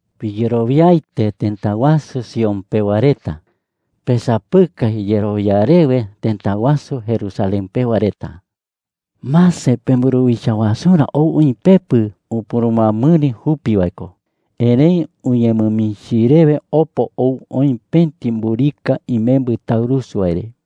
9¡Piyerowiaete, tëta wasu Sion Sion ko jae tëta wasu Jerusalén. pewa reta! ¡Pesapɨkai yerowia rewe, tëta wasu Jerusalén pewa reta! Mase, pemburuwicha wasurä ou oï pepɨ; upurumɨamɨri jupi wae ko. Erëi uñemɨmichi rewe opo ou oï pëti mburika imembɨ taurusu wae re.